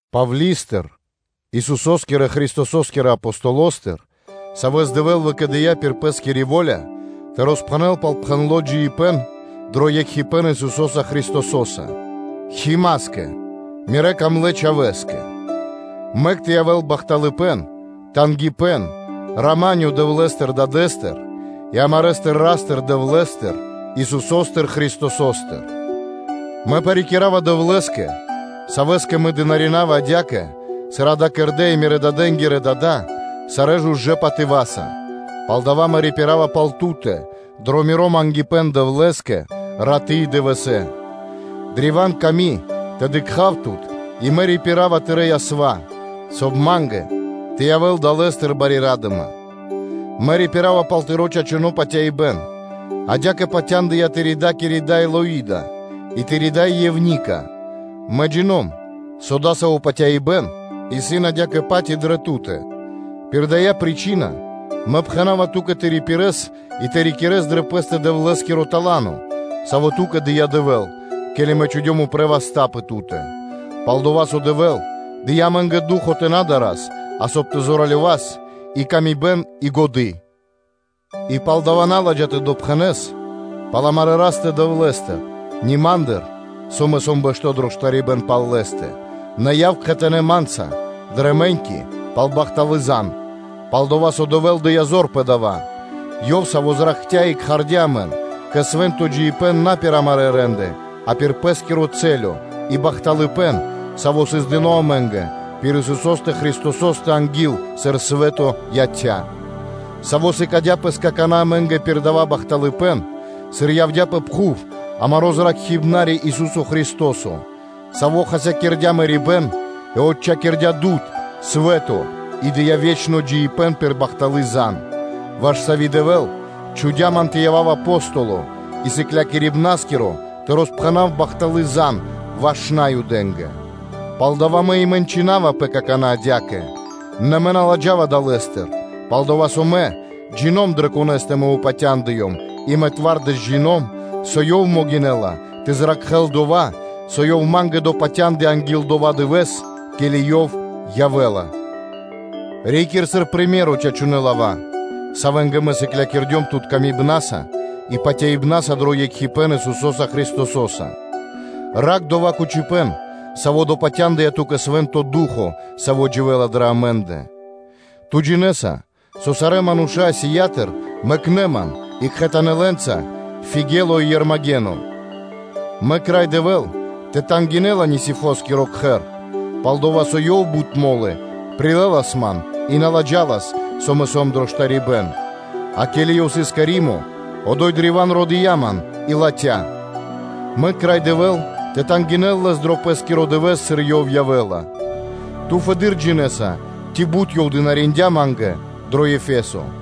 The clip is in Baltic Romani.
Павли́стыр, Исусо́скирэ Христосо́скирэ Апостолостыр, савэ́с Дэвэ́л выкэдыя́ пир Пэ́скири во́ля тэ роспхэнэл пал пхэндло́ джиибэ́н дро екхипэ́н Исусо́са Христосо́са. Химаскэ, мирэ́ дрогонэ́ чхавэ́скэ: мэк тэ явэ́л бахталыпэ́н, тангипэ́н, рама́нё Дэвлэ́стыр Дадэ́стыр и амарэстыр Ра́стыр-Дэвлэ́стыр, Исусо́стыр Христосостыр. Мэ парикирава Дэвлэ́скэ, Савэ́скэ мэ дынаринава (служынава) адя́кэ, сыр дава́ кэрдэ́ и мирэ́-дадэнги́рэ дада́ сарэ́ жужэ́ патыва́са, палдава́ мэ рипирава пал ту́тэ дро миро мангипэ́н Дэвлэ́скэ раты́ и дывэсэ́, древа́н ками тэ дыкха́в тут и мэ рипирава тырэ́ ясва, соб (кай) ма́нгэ тэ явэ́л далэ́стыр бари ра́дыма; мэ рипирава пал тыро́ чачуно́ патяибэ́н; адя́кэ патяндыя тырэ́-дакири дай Лоида и тыри́ дай Евника, мэ джино́м, со дасаво патяибэ́н исын адя́кэ-паць и дрэ ту́тэ. Пир дая́ причына мэ пхэна́ва ту́кэ тэ рипирэс и тэ рикирэс дрэ пэ́стэ Дэвлэ́скиро тала́но, саво́ ту́кэ дыя́ Дэвэ́л, ке́ли мэ чхудём упрэ́ васта́ пэ ту́тэ. Пал-дова́ со Дэвэ́л дыя́ амэ́нгэ ду́хо (фа́но) тэ на дарас, а соб (кай) тэ зоралёвас, и паты́в кэ яви́р мануша́, и годы́. И палдава́ на ладжа тэ допхэнэс пал амарэ́ Растэ-Дэвлэ́стэ, ни ма́ндыр, со мэ сом дро штарибэ́н пал Лэ́стэ, нэ яв кхэтанэ́ ма́нца дрэ мэ́ньки пал бахталы́ зан, пал-дова́ со Дэвэ́л дыя́ зор пэ дава́, Ёв, Саво́ зракхця́ и кхардя́ амэн кэ свэ́нто джиибэ́н на пир амарэ́ рэ́нды, а пир Пэ́скири дума и бахталыпэ́н, саво́ сыс дыно́ амэ́нгэ пир Исусо́стэ Христосо́стэ анги́л, сыр свэ́то яця́, Саво́ сыкадя́ пэс какана́ амэ́нгэ пир дава́ бахталыпэ́н, сыр явдя́ пэ пхув амаро́ Зракхибнари, Ису́со Христо́со, Саво́ хасякирдя́ мэрибэ́н и отчхакирдя́ дуд (свэ́то) и дыя́ ве́чно джиибэ́н пир бахталы́ зан (звесь); ваш сави́ Дэвэ́л чхудя́ ман тэ явав Апостолоса и сыклякирибнаскирэса тэ роспхэнав бахталы́ зан ваш Наюдэ́нгэ. Пал дава́ мэ и мэнчынавапэ какана́ адя́кэ; нэ мэ на ладжава далэ́стыр, пал-дова́ со мэ джино́м дрэ Конэ́стэ мэ упатяндыём и мэ зоралэ́с (твардэс) джино́м, со Ёв могинэ́ла тэ зракхэ́л дова́, со ёв ма́нгэ допатяндыя анги́л дова́ Дывэ́с, ке́ли Ёв явэ́ла. Рикир сыр приме́ро (сыкаибэ́н) чачунэ́ лава́, савэ́нгэ мэ сыклякирдём тут, выкэдыибнаса и патяибна́са дро екхипэ́н Исусо́са Христосо́са. Ракх дова́ кучипэ́н, саво́ допатяндыя ту́кэ Свэ́нто Ду́хо (Фа́но), Саво́ дживэ́ла дрэ амэ́ндэ. Ту джинэ́са, со сарэ́ мануша́ Асиятыр мэкнэ́ ман, и кхэтанэ́ лэ́нца Фигело и Ермагено. Мэк Рай Дэвэ́л тэ тангинэ́л Анисифороскиро кхэр, пал-дова́ со ёв бут мо́лы прилэлас ман, и на ладжалас, со мэ сом дро штарибэ́н; а ке́ли ёв сыс кэ Римо, одо́й древа́н родыя ман и латхя́ ман; мэк Рай Дэвэ́л тэ тангинэ́л лэс дро Пэ́скиро Дывэ́с, сыр Ёв явэ́ла; ту фэды́р джинэ́са, ци бут ёв дынариндя́ ма́нгэ дро Ефесо.